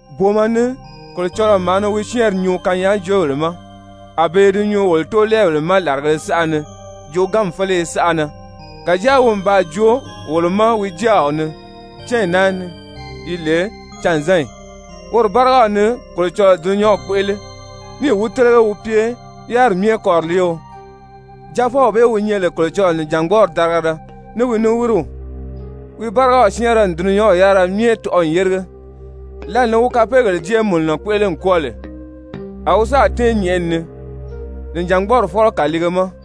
Booma ni Kolocɔlɔɔ maa ni wi syɛ́ɛnri nyuu kanyaajoobèle ma, a be i di nyuu wolo tóolɛɛbèle ma làrigēle saʔa ni jooganmi féleye saʔa na, kàjáa wi n baa joo wolo ma wi jáaw ni cányi naa ni yi lè canzanyi. Woro bárigaw ni Kolocɔlɔɔ dulunyanw kpéʔele, níì wi télege wi pye yáriri myɛ kɔriliio. Jaafɔw bee wi nyɛ lè Kolocɔlɔɔ nìjangbɔɔri darigala, ní wi niwiriw, wi bárigaw syɛ́ɛnrɛ n dulunyanw yárira myɛ tɔʔɔ n yérige. Lǎli ni wi kapeegèle jéemununɔ kpéʔele n kwɔ́ɔ lè, a wi sáà tɛ́ɛn nyɛ̀ʔɛni ni, Nìjangbɔɔri Fɔ́lɔ kàliige ma.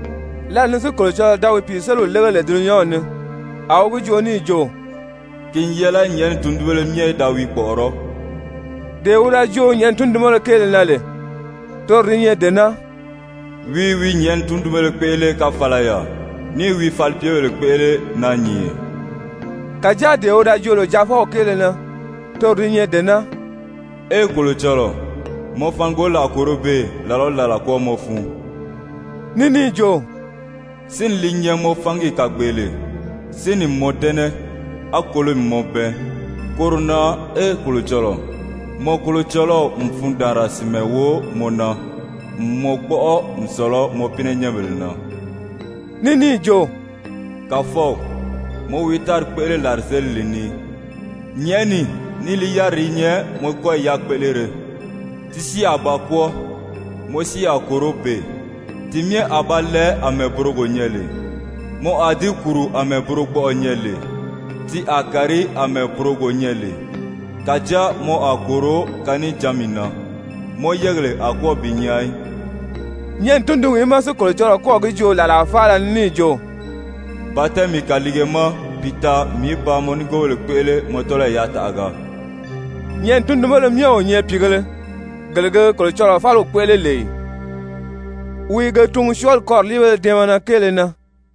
Lǎli ni si Kolocɔlɔɔ da wi pìiseliw lége lè dulunyanw ni, a wi gi joo níì jo: «Ki n yɛlɛ nyɛ̀ʔɛni tundunbéle myɛ í da wi kpɔ̀ʔɔrɔ́.» Dee wi da joo nyɛ̀ʔɛni tundunbéle kéele na lè, toro di nyɛ dee naa: «Wi i wi nyɛ̀ʔɛni tundunbéle kpéʔele káfalaya, ní i wi falipyebèle kpéʔele naanyìnye.» Kàjáa dee wi da joo lè Jaafɔw kéele na, toro di nyɛ dee naa: «Ee, Kolocɔlɔɔ, mɔ fangoli a kòro beè làla o làla kwɔ́ɔmɔ fun.» Ní níì jo: «Sínni li nyɛ mɔ fangi kàgbeele. Sínni n mɔ dɛ́nɛ, á kolomi mɔ bɛɛn. Koro na ee Kolocɔlɔɔ, mɔ Kolocɔlɔw n fundaanra sìnmɛ wo mɔ na n mɔ kpɔ́ʔɔ n sɔ̀lɔ mɔ pínɛnyɛnbèle na.» Ní níì jo: «Kàfɔw, mɔ wi tári kpéʔele làrizelili ni. Nyɛ̀ʔɛni ní li yáriri i nyɛ mɔ kɔ́yi yakpéʔelere. Ti si a ba kwɔ́ɔ, mɔ si a kòro beè. Ti myɛ a ba lɛɛ àmɛɛ burogo nyɛ lè. Mɔ a di kùru àmɛɛ burogbɔʔɔ nyɛ lè, ti a kàri àmɛɛ burogo nyɛ lè, kàjáa mɔ a kòro kanijanmi na, mɔ yɛ́ɛgèle a kwɔ́ɔ bi nyaa í.» Nyɛ̀ʔɛni tundunwìí má si Kolocɔlɔɔ kɔ́ɔ̀ gi joo làlaa faala ni níì jo: «Ba tɛ́ɛn mii kàliige ma bi taa mii í ba mɔ nigoobèle kpéʔele mɔ tɔ́lɔyi yataʔaga?» Nyɛ̀ʔɛni tundunbéle myɛ o nyɛ pìigēle, gele ge Kolocɔlɔɔ fáliw kpéʔele lè ì? Wi i ge tungu syɔɔli kɔriliibéle dɛɛmɛnɛ kéele na.